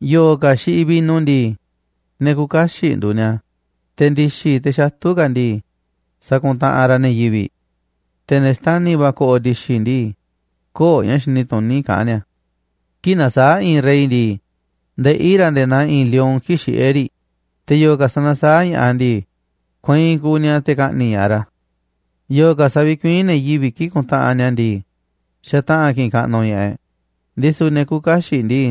Yo̱o̱ ka̱ xiꞌiꞌ vino ndii, ne̱ küuꞌ kaxiꞌ nduuꞌ ni̱a̱, te̱ ndi̱xi̱ teꞌ xatu̱ ka̱ ndii, sakuntaꞌanꞌ raꞌ ne̱ yivi̱ꞌ. Te̱ ne̱ xtani̱ va̱ ko̱ꞌo̱ ndi̱xi̱ ndii, kö̱o̱ ña̱ xini tuní kaꞌán ni̱a̱. Kii̱ꞌ nasaáꞌ i̱i̱n rey ndii, ndeꞌí ra̱ nde̱e̱ naa i̱i̱n lion kii̱ꞌ xiꞌé riꞌ, te̱ yo̱o̱ ka̱ sanasaáꞌ ña̱ꞌaꞌ ndii, kueinꞌ kuuꞌ ni̱a̱ te̱ ka̱ꞌni̱ꞌ ña̱ꞌaꞌ ra̱. Yo̱o̱ ka̱ savikuiín ne̱ yivi̱ꞌ kii̱ꞌ kuntaꞌanꞌ ni̱a̱ ndii, xataꞌa̱n ki̱ꞌi̱n kaꞌnuꞌ ña̱ꞌaꞌ e̱ꞌ, ndisu̱ ne̱ küuꞌ kaxiꞌ ndii,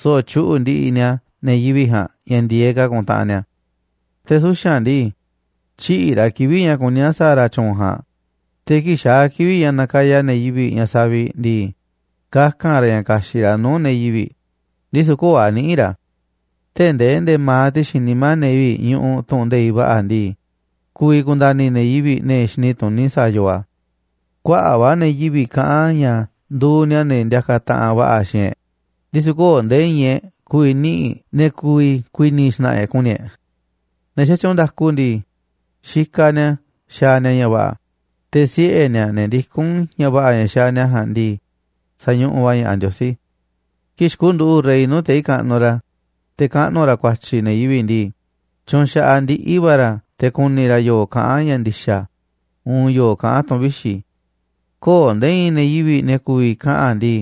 so̱ꞌo̱ tyuꞌu̱ꞌ ndiꞌiꞌ ni̱a̱ ne̱ yivi̱ꞌ ja̱a̱nꞌ ña̱ ndi̱e̱eꞌ ka̱ ku̱ntaꞌanꞌ ni̱a̱. Te̱ suxa̱nꞌ ndii, tyïꞌiꞌ ra̱ kivi̱ꞌ ña̱ kuní a̱ sa̱a̱ ra̱ tyu̱u̱n ja̱a̱nꞌ, te̱ kii̱ꞌ xaa̱ kivi̱ꞌ ña̱ nakaya ne̱ yivi̱ꞌ ña̱ saviꞌ ndii, kaka̱n ra̱ ña̱ ka̱xi̱ꞌ ra̱ nuu̱ꞌ ne̱ yivi̱ꞌ, ndisu̱ köo̱ꞌ a̱ niꞌi̱ꞌ ra̱. Tee̱ꞌ ndee nde̱ma̱aꞌ ti̱xi̱n nimá ne̱ yivi̱ꞌ ñuꞌuꞌ tu̱ꞌu̱n nde̱iꞌ va̱ꞌa̱ ndii, ku̱vi̱ ku̱nda̱ni̱ ne̱ yivi̱ꞌ, ne̱ xini tuní sa̱a̱ yoo a̱. Kuaꞌa̱ꞌ va̱ ne̱ yivi̱ꞌ kaꞌán ña̱ nduuꞌ ni̱a̱ ne̱ ndiakaꞌ taꞌanꞌ va̱ꞌa̱ xiinꞌ e̱ꞌ, ndisu̱ köo̱ꞌ nde̱e̱ i̱i̱n e̱ꞌ ku̱vi̱ niꞌi̱ꞌ ne̱ ku̱vi̱ ku̱i̱ni̱ xna̱ꞌa̱ e̱ꞌ ku̱ni̱ e̱ꞌ. Ne̱ xatyuunꞌ nda̱ku ndii, xikaꞌ ni̱a̱ xaaꞌ ni̱a̱ ña̱ va̱ꞌa̱, te̱ siꞌe̱ ni̱a̱, ne̱ ndikún ña̱ va̱ꞌa̱ ña̱ xaaꞌ ni̱a̱ ja̱a̱nꞌ ndii, sa̱ñuꞌuꞌ va̱ ña̱ꞌaꞌ Ndiosí. Kii̱ꞌ xikunduꞌu̱ꞌ rey nuu̱ꞌ tei̱ kaꞌnuꞌ ra̱, te̱ kaꞌnu̱ ra̱ ku̱a̱tyi̱ ne̱ yivi̱ꞌ ndii, tyunxaꞌaꞌ ndiꞌi̱ va̱ ra̱ te̱ ku̱ni̱ ra̱ yo̱o̱ kaꞌán ña̱ ndi̱xa̱ uun yo̱o̱ kaꞌán tu̱ꞌu̱n vixi̱. Köo̱ꞌ nde̱e̱ i̱i̱n ne̱ yivi̱ꞌ, ne̱ ku̱vi̱ kaꞌa̱n ndii: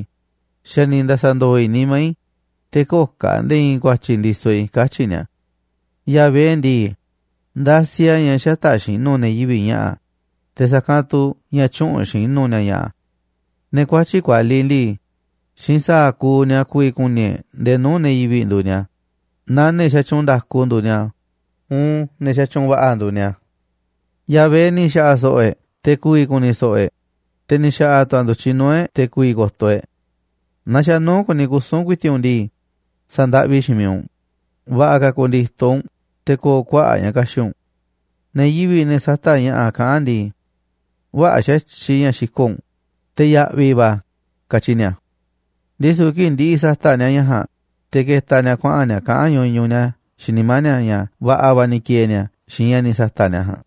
“Xa̱ ni̱ nda̱sa̱ndo̱o̱ i̱ nimá i̱, te̱ köo̱ꞌ ka̱ nde̱e̱ i̱i̱n ku̱a̱tyi̱ ndisoꞌ i̱”, katyi̱ ni̱a̱. Yahvé ndii, ndasiꞌ a̱ ña̱ xätaꞌ xinu̱ ne̱ yivi̱ꞌ ña̱ꞌa̱, te̱ sa̱kanꞌ tu̱ ña̱ tyüꞌunꞌ xinu̱ ni̱a̱ ña̱ꞌa̱. Ne̱ kuatyi̱ꞌ kualiꞌ ndii, xiinꞌ sa̱a̱ kuuꞌ ni̱a̱ ku̱vi̱ ku̱ni̱ e̱ꞌ ndee nuu̱ꞌ ne̱ yivi̱ꞌ nduuꞌ ni̱a̱, naaꞌ ne̱ xatyuunꞌ nda̱ku nduuꞌ ni̱a̱, uun ne̱ sa̱tyuunꞌ va̱ꞌa̱ nduuꞌ nia̱. Yahvé ni̱ xa̱ꞌa̱ so̱ꞌo̱ e̱ꞌ te̱ ku̱vi̱ ku̱ni̱ so̱ꞌo̱ e̱ꞌ, te̱ ni̱ xa̱ꞌa̱ tu̱ a̱ ndu̱tyiꞌ nuu̱ꞌ e̱ꞌ te̱ ku̱vi̱ ko̱to̱ e̱ꞌ. Naaꞌ xa̱ nuu̱ꞌ kuni kusu̱n ku̱i̱ti̱ꞌ u̱nꞌ ndii, sa̱ndaꞌvi xiinꞌ miiꞌ u̱nꞌ, va̱ꞌa̱ ka̱ ku̱ndi̱to̱ u̱nꞌ te̱ ko̱o̱ kuaꞌa̱ꞌ ña̱ ka̱xi̱ꞌ u̱nꞌ. Ne̱ yivi̱ꞌ, ne̱ sata̱ꞌ ña̱ꞌa̱ kaꞌán ndii: “Vä̱ꞌa̱ xa̱tyiꞌ ña̱ xiko̱ꞌ u̱nꞌ, te̱ ya̱ꞌvi̱ va̱ a̱”, katyi ni̱a̱. Ndisu̱ kii̱ꞌ ndi̱ꞌi̱ sa̱ta̱ꞌ ni̱a̱ ña̱ ja̱a̱nꞌ, te̱ ke̱ta̱ ni̱a̱ kuaꞌa̱n ni̱a̱ kaꞌán ñuñuꞌ ni̱a̱ xiinꞌ nimá ni̱a̱ ña̱ va̱ꞌa̱ va̱ ni̱ ki̱e̱e̱ ni̱a̱ xiinꞌ ña̱ ni̱ sa̱ta̱ꞌ ni̱a̱ ja̱a̱nꞌ.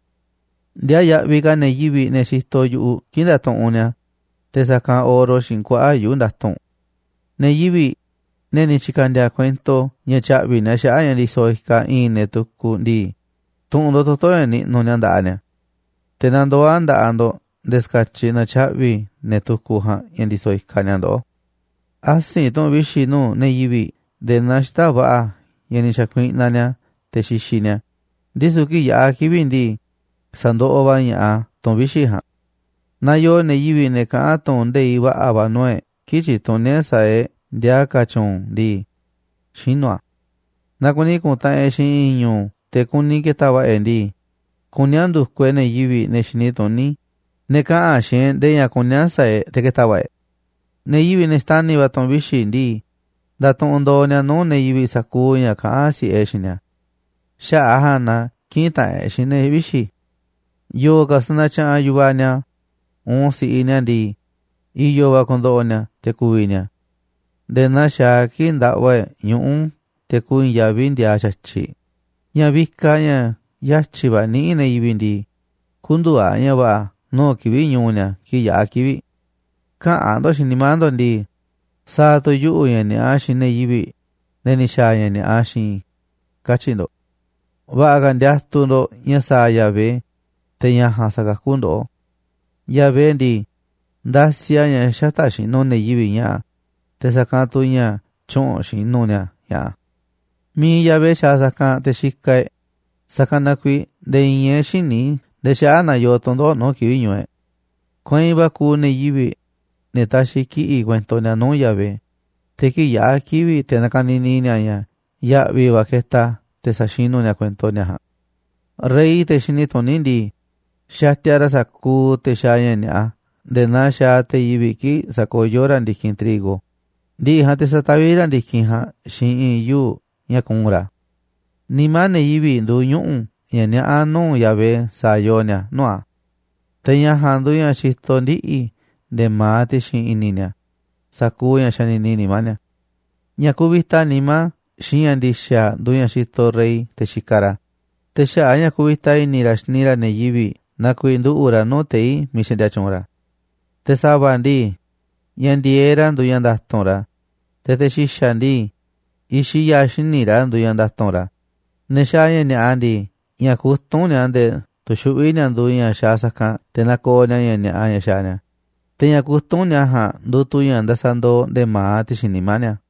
Ndiaa yaꞌviꞌ ka̱ ne̱ yivi̱ꞌ, ne̱ xitoꞌ yu̱ꞌuꞌ kii̱ꞌ ndatuꞌunꞌ ni̱a̱ te̱ sa̱kanꞌ oro xiinꞌ kuaꞌa̱ꞌ yuu̱ꞌ nda̱tu̱nꞌ. Ne̱ yivi̱ꞌ, ne̱ ni̱ tyi̱ka̱ndi̱a̱ kuento ña̱ tya̱ꞌvi̱ ni̱a̱ xaꞌa̱ꞌ ña̱ ndisoꞌ ikaꞌ i̱i̱n ne̱ tukuꞌ ndii, tu̱ꞌu̱n ndo̱ꞌ toto̱ ña̱ niꞌnuꞌ ni̱a̱ nda̱ꞌaꞌ ni̱a̱. Te̱ na ndoo̱ a̱ nda̱ꞌaꞌ ndo̱ꞌ nde̱e̱ ska̱tyiꞌ na̱tyaꞌvi̱ ne̱ tukuꞌ ja̱a̱nꞌ ña̱ ndisoꞌ ikaꞌ ni̱a̱ ndoꞌó. Asi̱nꞌ tu̱ꞌu̱n vixi̱ nuu̱ꞌ ne̱ yivi̱ꞌ nde̱e̱ naa xita̱ꞌ va̱ꞌa̱ ña̱ ni̱ xa̱kuiꞌnaꞌ ni̱a̱ te̱ xixiꞌ ni̱a̱, ndisu̱ kii̱ꞌ yaꞌa̱ kivi̱ꞌ ndii, sa̱ndoꞌoꞌ va̱ ña̱ꞌaꞌ a̱ tu̱ꞌu̱n vixi̱ ja̱a̱nꞌ. Naaꞌ yoo ne̱ yivi̱ꞌ, ne̱ kaꞌa̱n tu̱ꞌu̱n nde̱iꞌ va̱ꞌa̱ va̱ nuu̱ꞌ e̱ꞌ kii̱ꞌ tyituní e̱ꞌ sa̱a̱ e̱ꞌ ndiaa ka̱ tyu̱u̱n ndii, xinu̱ a̱. Naaꞌ kuni ku̱ntaꞌanꞌ e̱ꞌ xiinꞌ i̱i̱n ñu̱u̱ te̱ kuni ke̱ta̱ va̱ꞌa̱ e̱ꞌ ndii, kuní a̱ ndu̱kuꞌ e̱ꞌ ne̱ yivi̱ꞌ, ne̱ xini tuní, ne̱ kaꞌa̱n xiinꞌ e̱ꞌ ndee ña̱ kuní a̱ sa̱a̱ e̱ꞌ te̱ ke̱ta̱ va̱ꞌa̱ e̱ꞌ. Ne̱ yivi̱ꞌ, ne̱ xtani̱ va̱ tu̱ꞌu̱n vixi̱ ndii, ndatuꞌunꞌ ndo̱o̱ ni̱a̱ nuu̱ꞌ ne̱ yivi̱ꞌ sa̱kuuꞌ ña̱ kaꞌán si̱ꞌe e̱ꞌ xiinꞌ ni̱a̱. Xaꞌa̱ꞌ a̱ ja̱a̱nꞌ na kï̱ꞌi̱n taꞌanꞌ e̱ꞌ xiinꞌ ne̱ vixi̱. Yo̱o̱ ka̱ sanatyaꞌanꞌ yu̱vaꞌ ni̱a̱, uun si̱ꞌiꞌ ni̱a̱ ndii, i̱yo̱ va̱ ku̱ndo̱ꞌo̱ ni̱a̱ te̱ kuvi̱ ni̱a̱, nde̱e̱ naa xaaꞌ a̱ kii̱ꞌ ndaꞌva e̱ꞌ ñuꞌu̱ te̱ kui̱i̱n yaví ndiaaꞌ xa̱tyiꞌ. Ña̱ vikaꞌ ña̱ yatyi̱ va̱ niꞌíꞌ ne̱ yivi̱ꞌ ndii, kü̱ndu̱u̱ a̱ ña̱ va̱ꞌa̱ nuu̱ꞌ kivi̱ꞌ ñu̱u̱ ni̱a̱ kii̱ꞌ yaꞌa̱ kivi̱ꞌ. Käꞌa̱n ndo̱ꞌ xiinꞌ nimá ndo̱ꞌ ndii: “Sa̱a̱ tu̱ yuꞌu̱ ña̱ ni̱a̱ꞌa xiinꞌ ne̱ yivi̱ꞌ, ne̱ ni̱ xa̱a̱ ña̱ ni̱a̱ꞌa xiinꞌ i̱”, katyi̱ ndo̱ꞌ. Va̱ꞌa̱ ka̱ ndiatuꞌ ndo̱ꞌ ña̱ sa̱a̱ Yahvé, te̱ ña̱ ja̱a̱nꞌ sa̱kakú ndoꞌó. Yahvé ndii, ndasiꞌ a̱ ña̱ xätaꞌ xinu̱ ne̱ yivi̱ꞌ ña̱ꞌa̱, te̱ sa̱kanꞌ tu̱ ña̱ tyüꞌunꞌ xinú ni̱a̱ ña̱ꞌa̱. Mi̱iꞌ Yahvé xaaꞌ sa̱kanꞌ te̱ xikaꞌ e̱ꞌ, sa̱kanꞌ na kuiiꞌ nde̱e̱ i̱i̱n e̱ꞌ xïní ndee xaꞌa̱ꞌ na yoo tu̱ndoꞌo̱ꞌ nuu̱ꞌ kivi̱ꞌ ñu̱u̱ e̱ꞌ. Kueinꞌ va̱ kuuꞌ ne̱ yivi̱ꞌ, ne̱ taxiꞌ kiꞌi̱ꞌ kuento ni̱a̱ nuu̱ꞌ Yahvé, te̱ kii̱ꞌ yaꞌa̱ kivi̱ꞌ te̱ na̱ka̱ni̱ni̱ ni̱a̱ ña̱ ya̱ꞌvi̱ va̱ ketaꞌ a̱ te̱ sa̱xinu̱ ni̱a̱ kuento ni̱a̱ ja̱a̱nꞌ. Rey, te̱ xini tuní ndii, xatia ra̱ sa̱kuuꞌ te̱ xaaꞌ ña̱ ni̱a̱ꞌa nde̱e̱ naa xaaꞌ te̱ yivi̱ꞌ kii̱ꞌ sakayó ra̱ ndi̱kinꞌ trigo, ndi̱ꞌi̱ ja̱a̱nꞌ te̱ sa̱taví ra̱ ndi̱kinꞌ ja̱a̱nꞌ xiinꞌ i̱i̱n yuu̱ꞌ ña̱ kuu̱nꞌ ra̱ a̱. Nimá ne̱ yivi̱ꞌ nduuꞌ ñuꞌu̱ ña̱ niaꞌá nuu̱ꞌ Yahvé sa̱a̱ yoo ni̱a̱ nuu̱ꞌ a̱, te̱ ña̱ ja̱a̱nꞌ nduuꞌ ña̱ xitoꞌ ndiꞌi̱ nde̱e̱ ma̱aꞌ ti̱xi̱n i̱ni̱ ni̱a̱ sa̱kuuꞌ ña̱ xanini nimá ni̱a̱. Ña̱ kuvita nimá xiinꞌ ña̱ ndi̱xa̱ nduuꞌ ña̱ xitoꞌ rey te̱ xikaꞌ ra̱, te̱ xaꞌa̱ꞌ a̱ ña̱ kuvita i̱ni̱ ra̱ xini ra̱ ne̱ yivi̱ꞌ na kuiiꞌ nduꞌu̱ꞌ ra̱ nuu̱ꞌ tei̱ miiꞌ xaꞌndia tyuunꞌ ra̱. Te̱ sa̱va̱ ndii, ña̱ ndi̱e̱eꞌ ra̱ nduuꞌ ña̱ nda̱tu̱nꞌ ra̱, te̱ te̱ xi̱xa̱ ndii, i̱xiꞌ ya̱a̱ xíniꞌ ra̱ nduuꞌ ña̱ nda̱tu̱nꞌ ra̱. Ne̱ xaaꞌ ña̱ ni̱a̱ꞌa ndii, ña̱ kutúnꞌ ni̱a̱ nde̱e̱ tuxuꞌví ni̱a̱ nduuꞌ ña̱ xaaꞌ sa̱kanꞌ te̱ na̱ko̱o̱ nia̱ ña̱ ni̱a̱ꞌa ña̱ xaaꞌ ni̱a̱, te̱ ña̱ kutúnꞌ ni̱a̱ ja̱a̱nꞌ nduuꞌ tu̱ ña̱ ndasandooꞌ nde̱e̱ ma̱aꞌ ti̱xi̱n nimá ni̱a̱.